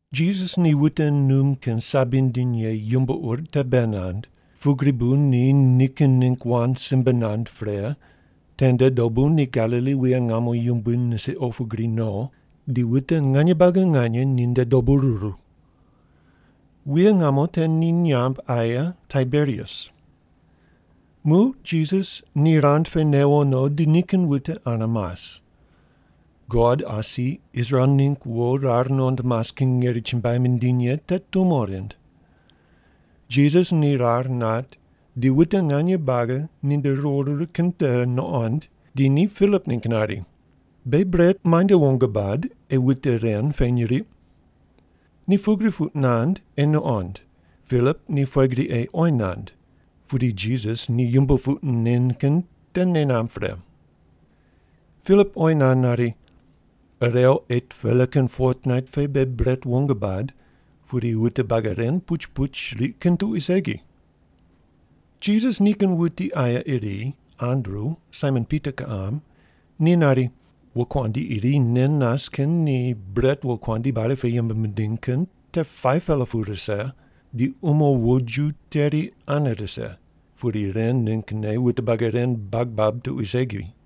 Jisas ni wute num kin sabi nindiny ye yumbo ur te bei nand, pugri bu ni nikin ningg wand simbe nand pre tende dobu ni Galili wuye ngamo yumbui nisiq opu gri no, di wute nganye buagi nganye ni nde dobu ruru. (Wuye ngamo te ni nyamb aye Taiberias.) Muq Jisas ni rand pe newo no di nikin wute ane mas. God asi Israel mingg wo rar nuqond mas kin ngeri chumbuai mindiny ye te tumo rind. Jisas ni rar nat di wute nganye buagi ni nde riwo ruru kin te nuqond, di ni Pilip ningg nari, “Beghi bret muainde wong bad ei wute ren peny riq?” Ni pugri puq nand ei nuqond Pilip ni pughe gri ei oyi nand, pudi Jisas ni yumbo puq nen kin te nei namb pre. Pilip oyi nand nari, “Irew 8-pela kin fotnait pe beghi bret wong bad, pudi wute buagi ren puch puch riq kin tuqui segi.” Jisas nikin wuti aye iri, Andru, Saimon Pita kiqam ni nari, “Wokuandi iri nen nas kin ni bret wokuandi bali pe yembe mindiny kin te 5-pela pu rise, di umo woju teri ane rise, pudi ren ninggne wute buagi ren bag bab tuqui segi.”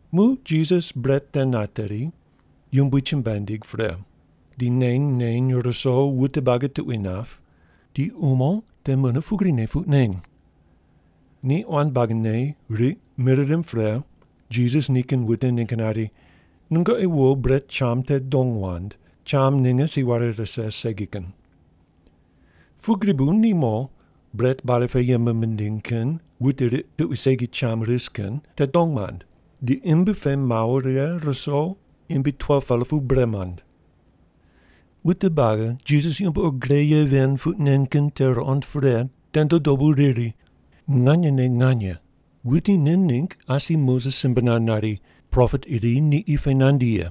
Muq Jisas bret te nateri, Yumbui chumbuai nindig pre. Di neny neny ruso wute buagi tuqui nap, di umo te mune pugrine puq neny. Ni quan buagine riq mir rimb pre, Jisas nikin wute ningg nari, “Nungoqi wo bret cham te dong wand, cham ninge si ware rise segi kin.” Pugri bu ni mo, bret bali pe yembe mindiny kin wute riq tuqui segi cham ris kin te dong mand, di imbi pe mawo righe ruso imbi 12-pela pu bre mand. Wute buagi Jisas yumbo ur gre ye ven puq nen kin te ruqond pre tende dobu riri, “Nganyene nganye, wuti nen ningg asi Moses simbe nand nari, ‘Propet iri ni qi pe nandi ye’.”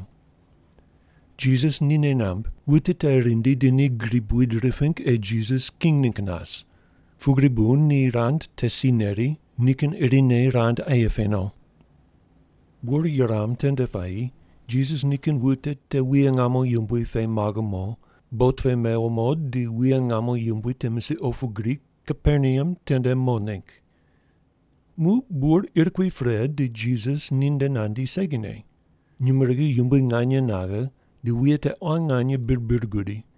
Jisas ni nei namb wute te rindi di ni gri buid riping ei Jisas king ningg nas, pugri bu ni rand te si neri, nikin irine rand aye pe no. Bur yuram tende puayi Jisas nikin wute te wuye ngamo yumbui pe maghe mo, bot pe mewo mo di wuye ngamo yumbui te misiq opu gri Kaperneam tende mo ningg. Muq bur ir kui pre, di Jisas ninde nandi segine. Nyumurighi yumbui nganye naghe, di wuye te quan nganye bir bir gudi.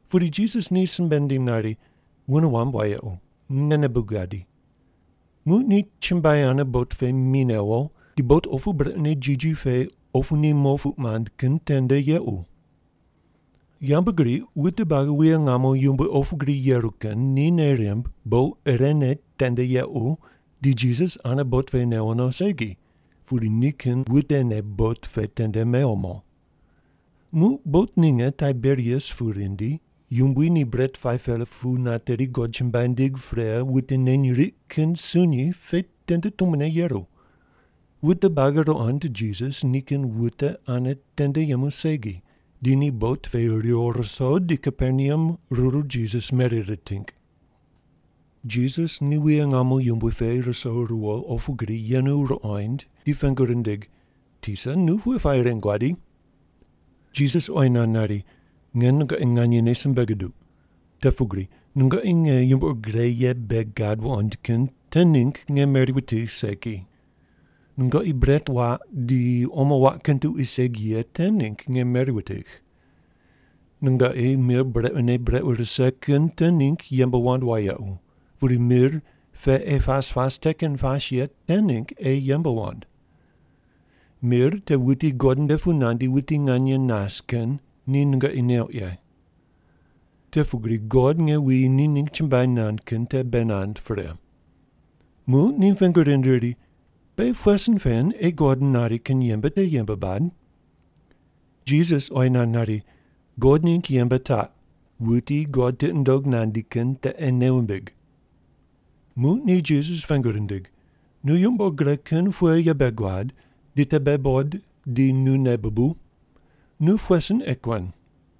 Pudi Jisas ni simbe nindim nari, “Wune wamb wayequ, ngene bu gadi.” Muq ni chumbuai ane bot pe mi newo, di bot opu brequne jiji pe opu ni mo puq mand kin tende yequ. Yambgriq wute buagi wuye ngamo yumbui opu gri yeru kin ni nei rimb bot irene tende yequ di Jisas ane bot pe newo no segi, pudi nikin wutene bot pe tende mewo mo. Muq bot ninge Taiberias pu rindi, Yumbui ni bret 5-pela pu nateri God chumbuai nindig pre wute neny riq kin sunyi pe tende tumone yeru. Wute buagi ruqond Jisas nikin wute ane tende yemu segi, di ni bot pe riwo ruso di Kaperneam ruru Jisas meri riting. Ni Jisas wuye ngamo yumbui pe ruso riwo opu gri yenu ruqoind di pengu rindig, “Tisa, nu pughe puayi ren guadi?” Jisas oyi nand nari, “Nge nungoqi nganyene simbe guduq, te pugri nungoqi nge yumbo ur gre ye bei gad wuqond kin te ningg nge meri wutigh segi. Nungoqi bret waq di omo waq kin tuqui segi ye te ningg nge meri wutigh. Nungoqi mir brequne brequ rise kin te ningg yembe wand wayequ, pudi mir pe ei pas pas te kin pas ye te ningg ei yembe wand. Mir te wuti God nde pu nandi wuti nganye nas kin ni nungoqi neuq ye. Te pugri God nge wuyi ni ningg chumbuai nand kin te bei nand pre.” Muq ni pengu rind riri, “Beghi pughe sin pen ei God nari kin yembe te yembe bad?” Jisas oyi nand nari, “God ningg yembe taq: wuti God tiqi nundog nandi kin te ei nei wumbig.” Muq ni Jisas pengu rindig, “Nu yumbo ur gre kin pughe ye bei guad, di te beghi buqod di nu nei bubuw? Nu pughe sin ei kuen?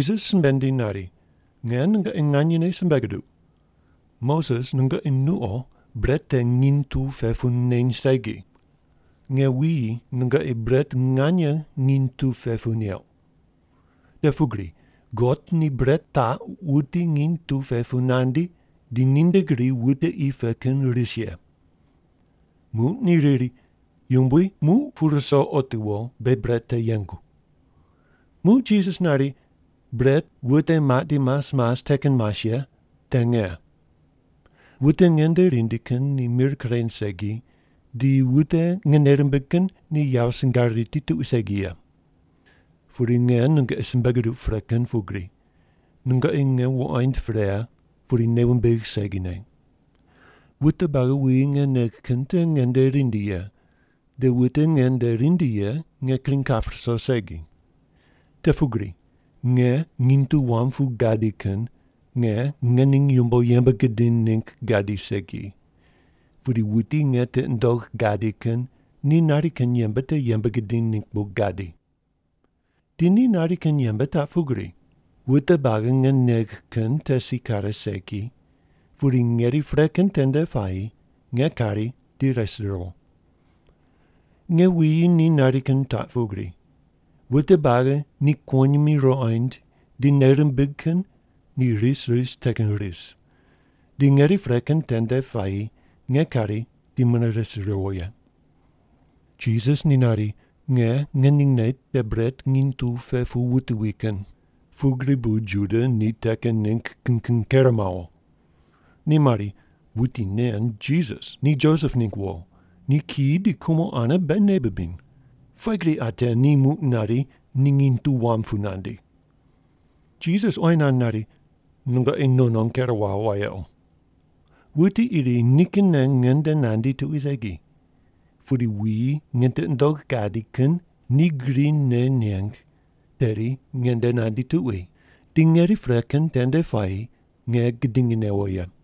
Jisas simbe nindiny nari, “Nge nungoqi nganyene simbe guduq, Moses nungoqi nuqo bret te nginy tu pe pu neny segi. Nge wuyi nungoqi bret nganye nginy tu pe pu neuq. Te pugri God ni bret taq wuti nginy tu pe pu nandi, di ni nde gri wute qi pe kin ris ye.” Muq ni riri, “Yumbui, muq pu ruso otiwo beghi bret te yengu.” Muq Jisas nari, “Bret wute maq di mas mas te kin mas ye te nge. Wute nge nde rindi kin ni mir kureny segi, di wute nge nei rimbigh kin ni yawo singar riti tuqui segi ye. Pudi nge nungoqi simbe guduq pre kin pugri, nungoqi nge wuqoind pre pudi nei wumbigh segine. Wute buagi wuyi nge negh kin te nge nde rindi ye, di wute nge nde rindi ye nge kring kap ruso segi. Te pugri nge nginy tu wam pu gadi kin nge ngening yumbo yembe gidiny ningg gadi segi, pudi wuti nge tiqi nundogh gadi kin ni nari kin yembe te yembe gidiny ningg bu gadi. Di ni nari kin yembe taq pugri: wute buagi nge negh kin te si kare segi, pudi ngeri pre kin tende puayi nge kari di res riwo. Nge wuyi ni nari kin taq pugri: wute buagi ni kuwonyimi ruqoind di nei rimbig kin ni ris ris te kin ris, di ngeri pre kin tende puayi nge kari di mune res riwo ye.” Jisas ni nari, “Nge ngeningne te bret nginy tu pe pu wuti wi kin,” pugri bu Juda ni te kin ningg kin kin ker mawo. Ni mari, “Wuti nen Jisas ni Josep ningg wo, ni kiyi di kumo ane beghi nei bibiny. Pughe gri ate ni muq nari ni nginy tu wam pu nandi?” Jisas oyi nand nari, “Nungoqi non non ker wawo wayequ. Wuti iri nikinne nge nde nandi tuqui segi, pudi wuyi nge tiqi nundogh gadi kin ni gri nei neng tedi nge nde nandi tuqui, di ngeri pre kin tende puayi nge gidingi newo ye.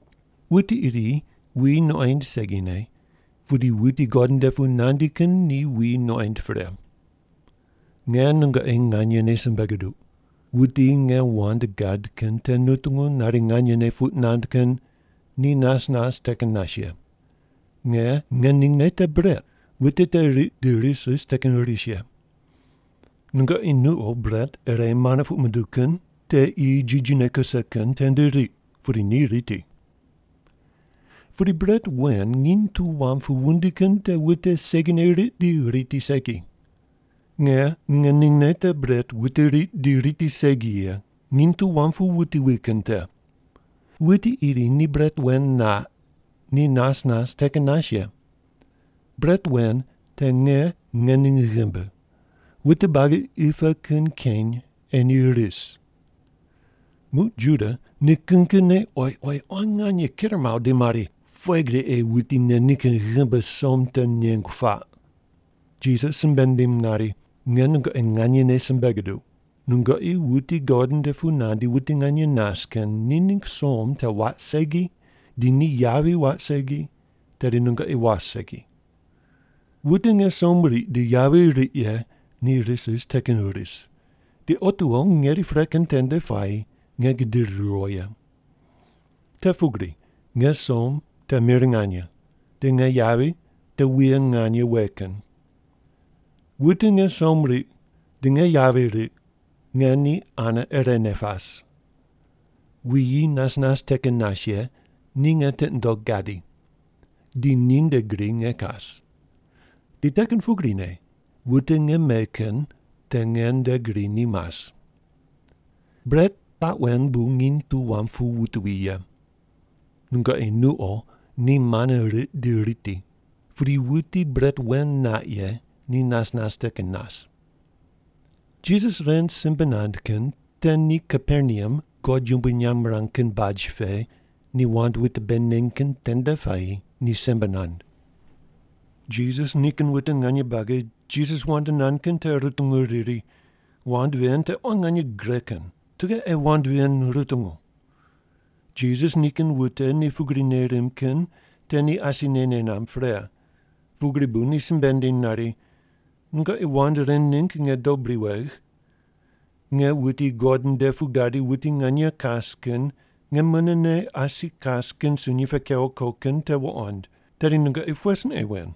Wuti iri wuyi nuqoind segine, pudi wuti God nde pu nandi kin ni wuyi nuqoind pre. Nge nungoqi nganyene simbe guduq, wuti nge wand gad kin te nutungu nari nganyene puq nand kin ni nas nas te kin nas ye. Nge ngeningne te bret, wute te riq di ris ris te kin ris ye. Nungoqi nuqo bret ire mana puq munduw kin te qi jijine kuse kin tende riq, pudi ni riti. Pudi bret wen nginy tu wam pu wundi kin te wute segine riq di riti segi. Nge ngeningne te bret wute riq di riti segi ye, nginy tu wam pu wuti wi kin te. Wuti iri ni bret wen naq, ni nas nas te kin nas ye. Bret wen te nge ngening ghimbi, wute buagi qi pe kin keny ei ni ris.” Muq Juda ni kin kinne oyi oyi quan nganye ker mawo di mari, “Pughe gri ei wuti nen nikin ghimbi som te nengu paq?” Jisas simbe nindim nari, “Nge nungoqi nganyene simbe guduq, nungoqi wuti God nde pu nandi wuti nganye nas kin ni ningg som te waq segi di ni yavi waq segi, tedi nungoqi was segi. Wute nge som riq di yavi riq ye ni ris ris te kin ris, di otiwo ngeri pre kin tende puayi nge gidiri riwo ye. Te pugri nge som te mir nganye, di nge yavi te wuye nganye we kin. Wute nge som riq, di nge yavi riq, nge ni ane irene pas. Wuyi nas nas te kin nas ye ni nge tiqi nundogh gadi, di ninde gri nge kas, di te kin pugrine wute nge me kin te nge nde gri ni mas. Bret taq wen bu nginy tu wam pu wuti wi ye. Nungoqi nuqo ni mana riq di riti, pudi wuti bret wen naq ye ni nas nas te kin nas.” Jisas ren simbe nand kin te ni Kaperneam God yumbui nyamb mirang kin baj pe ni wand wute bei neny kin tende puayi ni simbe nand. Jisas nikin wute nganye buagi Jisas wand nand kin te rutungu riri, “Wand ven te quan nganye gre kin. Tughe ei wand ven rutungu?” Jisas nikin wute ni pugri nei rimb kin te ni asine nei namb pre, pugri bu ni simbe nindiny nari, “Nungoqi wand ren ningg nge dob bri wegh? Nge wuti God nde pu gadi wuti nganye kas kin nge munene asi kas kin sunyi pe kewo ko kin te wuqond, tedi nungoqi pughe sin ei wen!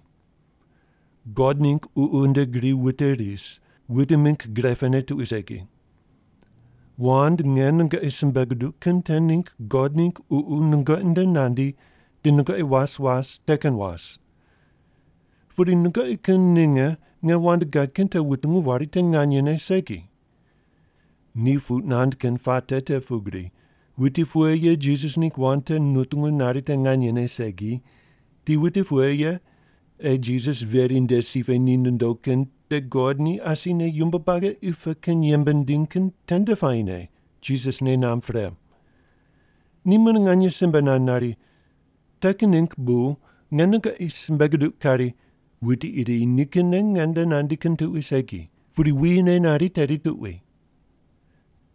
God ningg Ququ nde gri wute ris, wute mingg gre pene tuqui segi. Wand nge nungoqi simbe guduq kin te ningg God ningg Ququ nungoqi nde nandi di nungoqi was was te kin was. Pudi nungoqi kin ninge nge wand gad kin te wutungu wari te nganyene segi.” Ni puq nand kin puate te pugri wuti pughe ye Jisas ningg wand te nutungu nari te nganyene segi, di wuti pughe ye ei Jisas veri nde si pe ni nondo kin te God ni asine yumbo buagi qi pe kin yembe nindiny kin tende puayine Jisas nei namb pre. Ni mune nganye simbe nand nari, “Te kin ningg bu nge nungoqi simbe guduq kari, wuti iri nikinne nge nde nandi kin tuqui segi, pudi wuyine nari tedi tuqui.”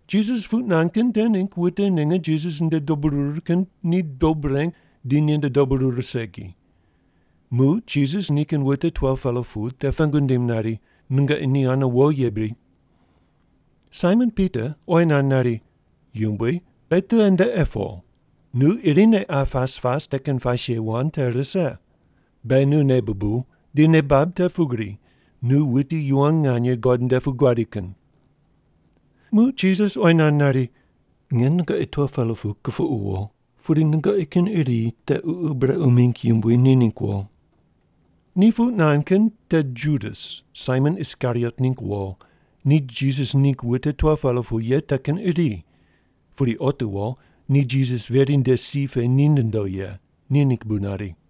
Jisas puq nand kin te ningg wute ninge Jisas nde dobu ruru kin ni dob reng di ninde dobu ruru segi. Muq Jisas nikin wute 12-pela pu te pengu nindim nari, “Nungoqi ni ane wo ye bri?” Saimon Pita oyi nand nari, “Yumbui, beghi tughe nde ei po? Nu irine qa pas pas te kin pas ye wand te rise. Beghi nu nei bubuw, di nei bab te pugri nu wuti yuwon nganye God nde pu guadi kin.” Muq Jisas oyi nand nari, “Nge nungoqi 12-pela pu kupuqu wo. Pudi nungoqi kin iri te ququ brequ mingg yumbui ni ningg wo!” Ni puq nand kin te Judas, Saimon Iskariot ningg wo, ni Jisas ningg wute 12-pela ye te kin iri, pudi otiwo ni Jisas veri nde si pe ni nondo ye, ni ningg bu nari.